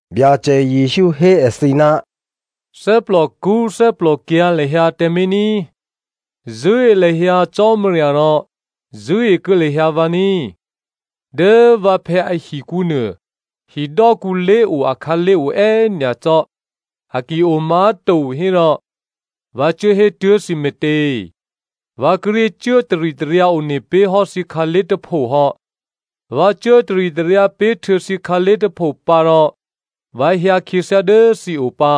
Byacè Jesǔ hé èthǐ, “Thè́plòkṳ́ thè́plòkyǎ̤ lahyǎ tǎmé̤ ní꤮. Zṳ̂́e lahyǎ Cò́marya rò zṳ̂́ekuô̌ lahyǎ vǎ ní꤮. Dố vǎphè̌ ahikǔ nuô, hidò́kǔ lé̤o akhǎlé̤ o è́nyacò́. A ki omá̤to hérò, vǎ cuố hé tuố̤ thǐ me̤tě? Vǎ kíré̤ cuố taritaryǎ one pé̤ hò́ thǐ khǎlé̤ tôpho hò́. Vǎ cuố taritaryǎ pé̤ htuô̌ thǐ khǎlé̤ tôpho pǎ rò vǎ hyǎ khyěthyá dố thǐo pǎ.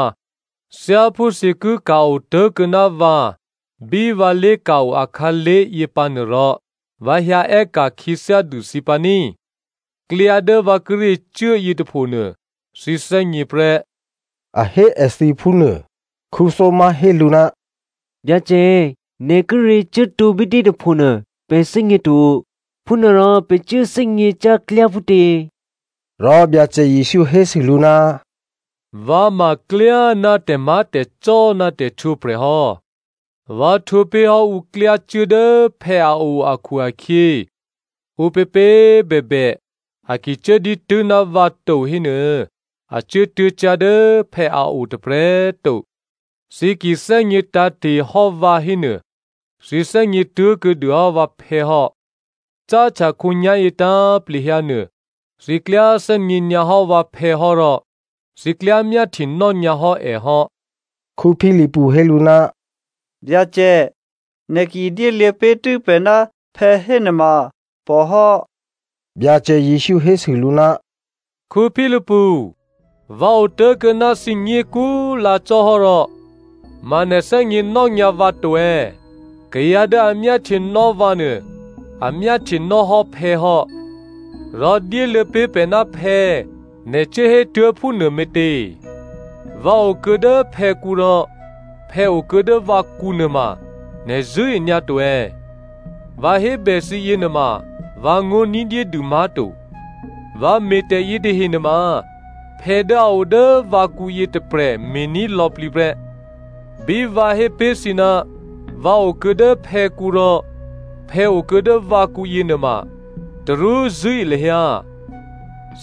Thyáphú thǐ ki ka̤ otố̤kuô̌ ná vǎ bí vǎ lé̤ka̤-o akhǎlé̤ yěpǎnuô rò, vǎ hyǎ è́ka̤ khyěthyá dû thǐ pǎ ní꤮. Klyá dố vǎ kíré̤ cuố yětôphonuô, thǐ thè́gněprè́,” a hé èthǐ phúnuô. Thomazo hé lǔ, “Byacè, nè̤ kíré̤ cuốtǒ bítě tôpho nuô pè̤ thè́gněto, phúnuôrò pè̤ cuố thè́gně cyá̤ klyá phútě?” Rò Byacè Jesǔ hésû lǔ, “Vǎ ma klyá ná tè̤má̤tè̤cò́ ná tè̤htwǒprè̤ hò́. Vǎ htwǒ pé̤hò́ ǔ klyácuố dố phè̌ a o akhu-akhyě, ǔpěpě꤮ bèbè, a ki cuố dǐtû́ ná vǎ to hénuô, a cuốtuố̤ cyá̤ dố phè̌ a o tôprè̤꤮ to. Thǐ ki thè́gně tǎ̤te̤hò́ vǎ hénuô, thǐ thè́gně tuố̤kuô̌ dûhò́ vǎphè̌ hò́. Cáhtya khǒnyá̤yě tǎ̤plehyǎnuô, thǐ klyá thè́gně nyǎhò́ vǎphè̌ hò́ rò thǐ klyá myáhtyenò́ nyǎ hò́ è hò́.” Philipu hé lǔ, “Byacè, nè̤ ki dyéluô̌ pé̤ tû́ pè̤ ná phè̌ hénuôma pòhò́.” Byacè Jesǔ hésû lǔ, “Philipu, vǎ otố̤kuô̌ ná thǐ nyě̤kú꤮ lǎ cò́hò́ rò ma nè̤ thè́gněnò́ nyǎ vǎ to è̌? Kayǎ dố a myáhtyenò́ vǎ nuô, a myáhtyenò́hò́ phè̌ hò́. Rò, ‘Dyéluô̌ pé̤ pè̤ ná phè̌,’ nè̤ cuốhétuố̤ phúnuô me̤tě? Vǎ okuô̌ dố phè̌kǔ rò phè̌ okuô̌ dố vǎkǔ nuôma, nè̤ zṳ̂́e nyǎto è̌? Vǎ hébè thǐ yěnuôma, vǎngó̤ ní̤dyédû má̤to. Vǎ me̤ tè̤ yětahe nuôma phè̌ dố a o dố vǎkǔyě tôprè̤ me̤ní̤ lò̌plǐ prè́. Bí vǎ hé pé̤ thǐ ná vǎ okuô̌ dố phè̌kǔ rò phè̌ okuô̌ dố vǎkǔ yěnuôma, tarú zṳ̂́e lahyǎ.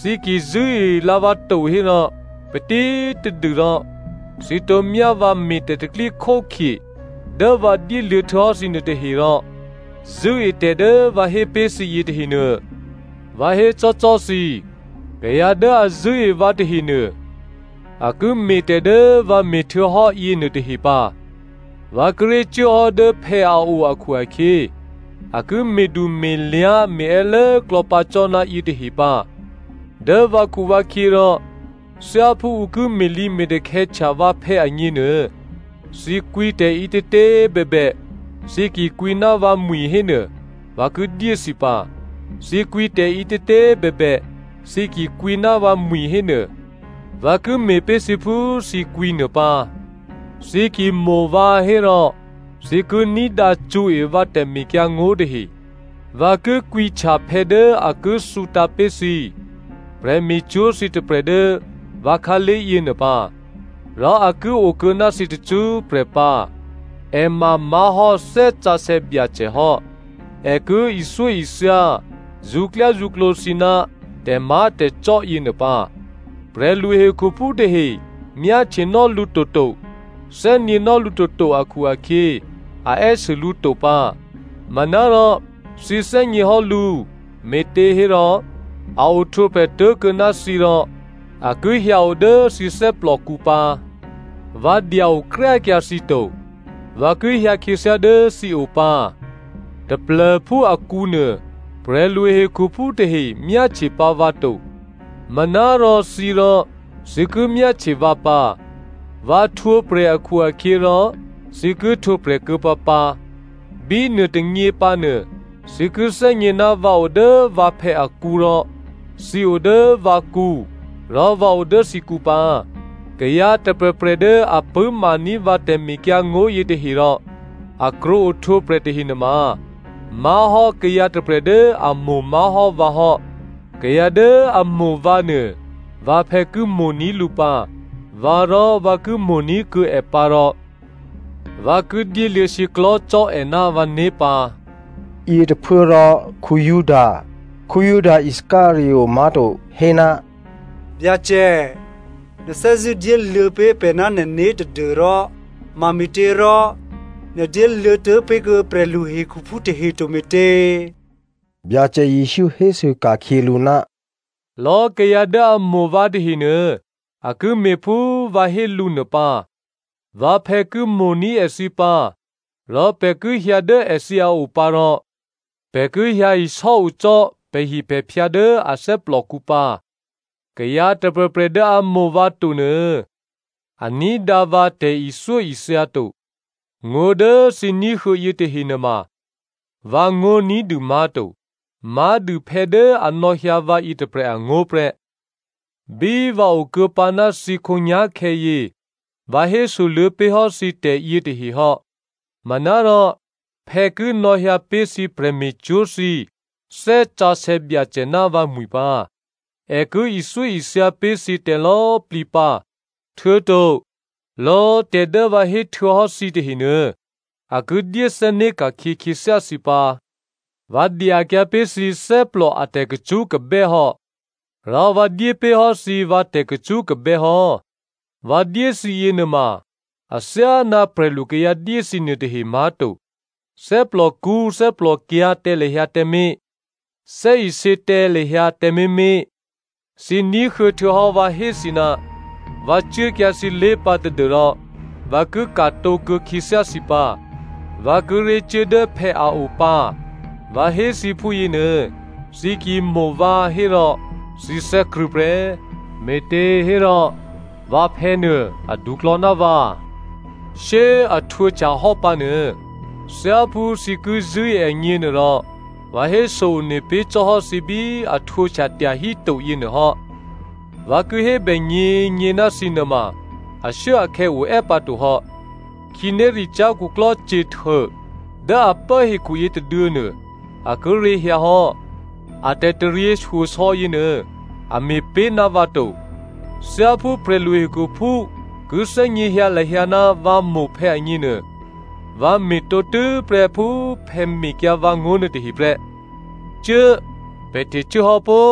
Thǐ ki꤮ zṳ̂́elǎ vǎ to hérò, patítadû rò thǐ tǒ myá vǎ me̤ tè̤pro̤tè̤prya̤ dố vǎ dyéluô̌ htuô̌hò́ nuôtahe rò zṳ̂́etè̤ dố vǎ hé pé̤ thǐ yětahe nuô. Vǎ hécò́cò́ thǐ, kayǎ dố a zṳ̂́e vǎ tahenuô, a ki me̤tè̤ dố vǎ me̤htuô̌hò́ yěnuôtahe pǎ. Vǎ kíré̤ cuốhò́ dố phè̌ a o akhu-akhyě, a ki me̤du me̤lyá̤ me̤è́lố klò̌pǎ cò́ ná yětahe pǎ. Dố vǎkhuvǎkhyě rò thyáphú ǔ ki me̤lǐme̤takhè̌htya vǎphè̌ agněnuô, thǐ kwǐtè̤ ǐtětě꤮ bèbè, thǐ ki kwǐ ná vǎmwi̤ hénuô, vǎ ki dyé thǐ pǎ. Thǐ kwǐ tè̤ǐtětě꤮ bèbè, thǐ ki kwǐ ná vǎmwi̤ hénuô, vǎ ki me̤pé̤ thǐ phú thǐ kwǐnuô pǎ. “Thǐ ki mo̤ vǎ hérò, thǐ ki ní̤dǎ cṳ̌e vǎ tè̤mekyǎngó̤ tahe. Vǎ ki kwǐhtya phè̌ dố a ki thǔtǎ̤ pé̤ thǐ prè̤me̤cwó̤ thǐ tôprè̤ dố vǎ khǎlé̤ yěnuô pǎ. Rò a ki okuô̌ ná thǐ tacṳ́prè̤ pǎ. È ma má̤hò́ Thè́ Sǎsè̌ Byacè hò́. È ki ithyóithya zṳ̌klyázṳ̌klǒ thǐ ná tè̤má̤tè̤cò́ yěnuô pǎ. Prè̤lu hekhuphú tahe myáhtyenò́ lǔ toto, thè́gněnò́ lǔ toto akhu-akhyě, a è́sû lǔ to pǎ. Manárò thǐ thè́gněhò́ lǔ, me̤těhérò a ohtwǒprè̤ tố̤kuô̌ ná thǐ rò a ki hyǎo dố thǐ thè́plòkǔ pǎ. Vǎ dya-okryákyǎ thǐ to. Vǎ ki hyǎ khyěthyá dố thǐo pǎ. Taplô̤phú akǔnuô, prè̤lu hekhuphú tahe myáhtye pǎ vǎ to. Manárò thǐrò, thǐ ki myáhtye vǎ pǎ. Vǎ htwǒprè̤ akhu-akhyěrò thǐ ki htwǒprè̤ kuô̌ pǎpǎ. Bínuôtônyě pǎnuô, thǐ ki thè́gně ná vǎ o dố vǎphè̌ akǔ rò thǐ o dố vǎkǔ rò vǎ o dố thǐkǔ pǎ. Kayǎ tôprè̤prè̤ dố a pṳ̂́maní̤ vǎ tè̤mekyǎngó̤ yětahe, rò a krwǒ ohtwǒprè̤ tahe nuôma má̤hò́ kayǎ tôprè̤ dố a mo̤ má̤hò́ vǎ hò́. Kayǎ dố a mo̤ vǎ nuô vǎphè̌ ki mo̤ní̤ lǔ pǎ. Vǎrò, vǎ ki mo̤ní̤kuô̌ è pǎ rò vǎ ki dyéluô̌ shyěklò̤́ cò́ è ná vǎné̤ pǎ.” Yětôphuốrò Juda (Juda Iscariot má̤to) hé, “Byacè, nè̤ thè́zṳ̂́ dyéluô̌ pé̤ pè̤ ná nè̤né̤ tadû́rò mame̤těrò nè̤ dyéluô̌ tuố̤pé̤kuô̌ prè̤lu hekhuphú tahe to me̤tě?” Byacè Jesǔ hésû ka̤khyě lǔ, “Lò̌ kayǎ dố a mo̤ vǎ tahenuô, a ki me̤ phú vǎ hé lǔ nuô pǎ. Vǎphè̌ ki mo̤ní̤ èthǐ pǎ, rò pè̤ ki hyǎ dố èthǐ a o pǎ rò pè̤ ki hyǎ isò́ o cò́ pè̤hipè̤phyǎ dố a thè́plòkǔ pǎ. Kayǎ tôprè̤prè̤ dố a mo̤ vǎ to nuô, a ní̤dǎ vǎ tè̤ithyóithya to. Ngó̤ dố thǐ ní̤huô̌ yětahe nuôma vǎngó̤ ní̤dû má̤to. Má̤dû phè̌ dố a nò̌hyǎ vǎ yětôprè̤ angó̤ prè́. “Bí vǎ okuô̌pǎ ná thǐ khǒnyá̤khè̌ yě, vǎ hésoluô̌ pé̤hò́ thǐ tè̤yětahe hò́. Manárò, phè̌ ki nò̌hyǎ pé̤ thǐ prè̤me̤cwó̤ thǐ Thè́ Sǎsè̌ Byacè ná vǎmwi̤ pǎ. È ki ithyóithya pé̤ thǐ tè̤lò̌꤮ plǐ pǎ, htuô̌to lò̌ tè̤ dố vǎ héhtuô̌hò́ thǐ tahenuô, a ki dyéthè́né̤ ka̤khyě khyěthyá thǐ pǎ. Vǎ dyakyǎ pé̤ thǐ thè́plò a tè̤kacṳ́kabè́ hò́. Rò vǎ dyé pé̤ hò́ thǐ vǎ tè̤kacṳ́kabè́ hò́. Vǎ dyé thǐ yěnuôma athyáná prè̤lukayǎ dyé thǐ nuôtahe má̤to. Thè́plòkṳ́ thè́plòkyǎ̤ tǎ lahyǎ tǎmé̤. Thè́isě tǎ lahyǎ tǎmé̤mé̤. “Thǐ ní̤huô̌ htuô̌hò́ vǎ hé thǐ, ‘Vǎ cuốkyǎ thǐlé̤ pǎ tadû́rò vǎ ki ka̤tǒkuô̌ khyěthyá thǐ pǎ.’ Vǎ kíré̤ cuố dố phè̌ a o pǎ, vǎ hé thǐ phúyěnuô, thǐ ki mo̤ vǎ hérò thǐ thè́krṳ̂̌ prè́, me̤těhérò vǎphè̌ nuô aduklò̌ ná vǎ. Shyé꤮ a htwǒhtyahò́ pǎnuô, thyáphú thǐ ki zṳ̂́e agněnuôrò, vǎ héso one pé̤ cò́hò́ thǐ bí a htwǒhtya tyahíto yěnuô hò́. Vǎ ki hébè nyě̤nyě̤ ná thǐ nuôma ashuốakhè̌ o è́ pǎtohò́. Khǐnéricyá̤ khuklò́ Satan dố a pố hekhu yětôduô̌nuô, a kíré̤ hyǎhò́. A tè̤taryěshyosò̌ yěnuô, a me̤ pé̤ ná vǎ to. Thyáphú prè̤lu hekhuphú ki thè́gněhyǎ lahyǎ ná vǎ mo̤ phè̌ agněnuô, vǎ me̤ tǒtû́prè́ phú phè̌ mehyǎ vǎ ngó̤ nuôtahe prè́. “Cuố꤮! Pè̤ htecuốhò́ pó!”